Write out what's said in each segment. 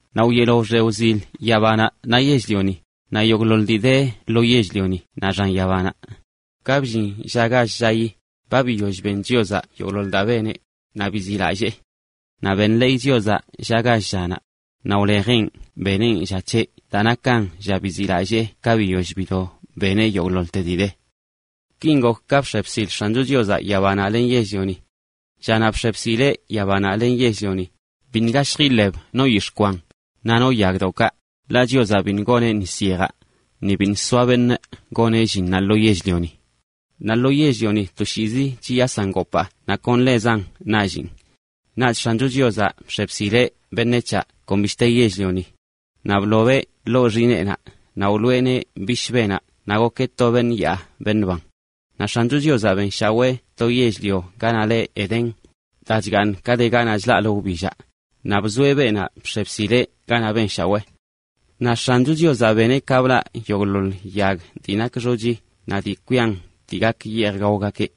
Naꞌ wyeelo wxe wzil yabanaꞌ naꞌ yell-lioni, naꞌ yogꞌḻoḻ dii de lo yell-lioni naꞌ xan yabanaꞌ. Ka bllin lla gall llayi, ba biyoll ben Chiozaꞌ yogꞌḻoḻ daa beneꞌ, naꞌ biziꞌlallee. Naꞌ benḻeeyeꞌ lla gall llanaꞌ, naꞌ wlejeꞌn beneꞌn lla c̱heꞌ daa nakan lla biziꞌlallee ka biyoll bido beneꞌ yogꞌḻoḻte dii de. Kin gok ka bx̱e bsil X̱ancho Chiozaꞌ yabanaꞌ len yell-lioni. Llanaꞌ bx̱e bsileꞌ yabanaꞌ naꞌ yell-lioni, biṉꞌ gashj iḻeb no yix̱ꞌ kwan, naꞌ no yagdoꞌkaꞌ, ḻaꞌ Chiozaꞌ biṉꞌ goneꞌ nis yejaꞌ, ni biṉꞌ soa beṉꞌ goneꞌ llinnaꞌ lo yell-lioni. Naꞌ lo yell-lioni toshiizi chiyasan gopaa naꞌ kon ḻezan nallin. Naꞌch X̱ancho Chiozaꞌ bx̱e bsileꞌ beṉec̱haꞌ kon bishte yell-lioni. Naꞌ blobeꞌ ḻoo xineenaꞌ naꞌ wloꞌeneꞌ bishbenaꞌ naꞌ gokeꞌ to beṉꞌ yaa beṉꞌ ban. Naꞌ X̱ancho Chiozaꞌ benshawee to yell-lio ganaꞌ le Edén, daa chgaaṉ ka de ganaꞌ chlaꞌlə wbillaꞌ, naꞌ bzoeꞌ beenaꞌ bx̱e bsileꞌ ganaꞌ benshawee. Naꞌ X̱ancho Chiozaꞌ beneꞌ ka blaꞌ yogꞌḻoḻ yag dii nak xochi naꞌ dii kwian dii gak yeej gaogakeꞌ.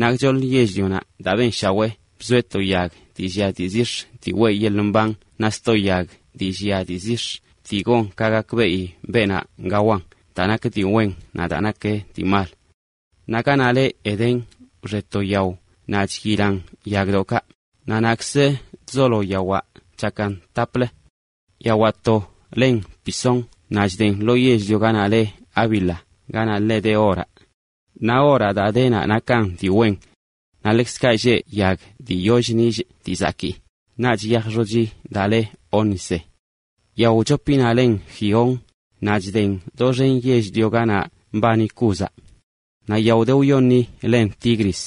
Naꞌ gchoḻ yell-lionaꞌ daa benshawee bzoeꞌ to yag dii llia dii zix̱ dii weꞌ yeḻꞌ mban naꞌ sto yag dii llia dii zix̱ dii gon ka gakbeꞌi beenaꞌ gawan daa nak dii wen naꞌ daa nak dii mal. Naꞌ ganaꞌ le Edén wxe to yao naꞌ chyilan yagdoꞌkaꞌ, naꞌ naꞌkz chzolo yawaꞌ chakan taplə. Yawaꞌ to len Pisón naꞌ chden lo yell-lio ganaꞌ le Havila ganaꞌ ḻe de oraꞌ. Naꞌ oraꞌ daa de naꞌ nakan dii wen. Naꞌ ḻekzkaꞌ lleꞌ yag dii yollə nillꞌ dii zakii, naꞌch yaj xochi daa le ónice. Yao wchopinaꞌ len Gihón, naꞌ chden doxen yell-lio ganaꞌ mbani Cúzaꞌ. Naꞌ yao de wyoṉinaꞌ len Tigris,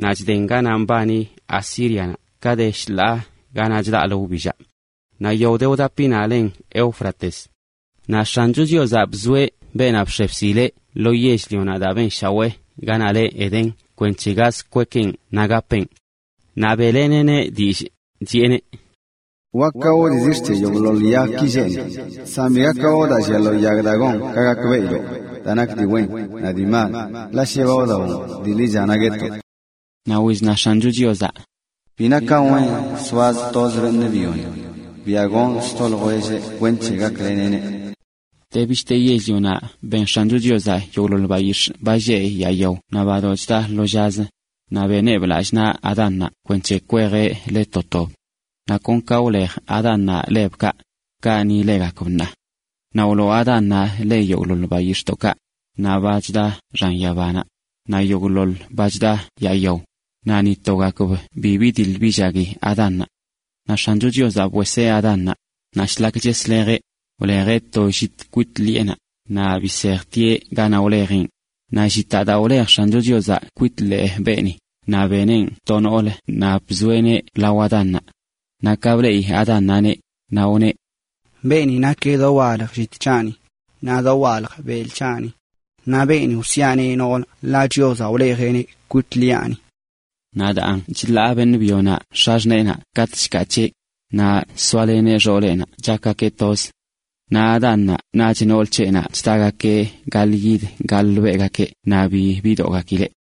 naꞌ chden ganaꞌ mbani Asírianaꞌ ka de shḻaa ganaꞌ chlaꞌlə wbillaꞌ. Naꞌ yao de wdapinaꞌ len Éufrates. Naꞌ X̱ancho Chiozaꞌ bzoeꞌ beenaꞌ bx̱e bsileꞌ ḻoo yell-lio daa benshawee ganaꞌ le Edén kwenc̱he gaz kwekeꞌn naꞌ gapeꞌn. Naꞌ beꞌleneꞌneꞌ dillꞌ, chiꞌeneꞌ: “Wak gawoꞌ dii zix̱ c̱he yogꞌḻoḻ yagki lleꞌ ni, san bi gak gawoꞌ daa llia lo yag daa gon ka gakbeꞌiloꞌ daa nak dii wen naꞌ dii mal, ḻaꞌ shi ba wdawoꞌn dii ḻicha naꞌ guetoꞌ.” Naꞌ wizna X̱ancho Chiozaꞌ: “Bi nakan wen zoaz toz beṉꞌ byoni. Biaꞌ gonꞌ sto ljwelleꞌ kwenc̱he gakleneꞌ ḻeꞌ.” De bishte yell-lionaꞌ ben X̱ancho Chiozaꞌ yogꞌḻoḻ bayix̱ꞌ ba lleꞌ yaa yao naꞌ badoꞌ chda lo llazə, naꞌ beneꞌb lallꞌ naꞌ Adánnaꞌ kwenc̱he kwejeꞌ le to tob. Naꞌ kon ka wlej Adánnaꞌ lebkaꞌ, kaꞌ ni legakb ṉaa. Naꞌ wloo Adánnaꞌ le yogꞌḻoḻ bayix̱ꞌdoꞌkaꞌ, naꞌ badoꞌ chda xan yaba, naꞌ yogꞌḻoḻ ba chda yaa yao, naꞌ ni togakb bi bidiḻ billagui Adánnaꞌ. Naꞌ X̱ancho Chiozaꞌ bweseꞌ Adánnaꞌ, naꞌ shlak cheslejeꞌ, wlejeꞌ to llit kwit ḻiꞌenaꞌ, naꞌ bisejtieꞌ ganaꞌ wlejeꞌn. Naꞌ llitaꞌ daa wlej X̱ancho Chiozaꞌ kwit ḻee beeni, naꞌ beneꞌn to noolə naꞌ bzoeꞌneꞌ lao Adánnaꞌ. Naꞌ ka bleꞌi Adánnaꞌneꞌ, naꞌ wneꞌ: “Beeni nakeꞌ dowalj llit c̱haꞌni, naꞌ dowalj belꞌ c̱haꞌni. Naꞌ beeni lieꞌ ‘noolə’ ḻaꞌ Chiozaꞌ wlejeꞌneꞌ kwit ḻee beṉꞌ byonaꞌ.” Naꞌ daan chḻaa beṉꞌ byonaꞌ x̱axṉeenaꞌ katꞌ chkaa c̱heꞌ, naꞌ chzoaleneꞌ xooleꞌnaꞌ chakgakeꞌ toz. Naꞌ Adánnaꞌ naꞌch nool c̱heꞌnaꞌ chdagakeꞌ gaḻꞌyid gaḻꞌbelꞌgakeꞌ naꞌ bi bidoꞌgakileꞌ.